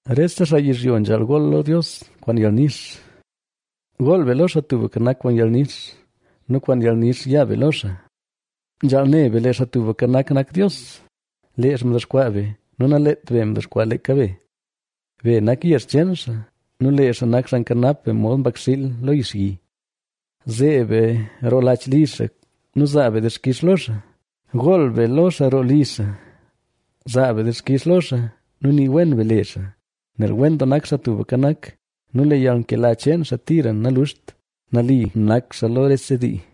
Rese xaa yizhyo nzhaal gool lo Dios kwaan yalnix. Gool be lo Xaa Tubka Nak kwaan yalnix nu kwaan yalnix ya be lo xaa. Nzhaal ne be, lee Xaa Tubka Nak nak Dios; lee xaa mdexkwaa be nu naleet be mdexkwaa leeka be. Be nak yezh cheen xaa nu lee xaa nak xaa nkanap be mod mbakxiil lo yixyi. Zeeb be roo lach li xaa nu zaa be dixkix lo xaa; gool be lo xaa roo li xaa. Zaa be dixkix lo xaa nu nii wen be le xaa. Nel wen doo nak Xaa Tubka Nak nu lee yalnkela cheen xaa tira naluxt; nali nak xaa lo rese dii.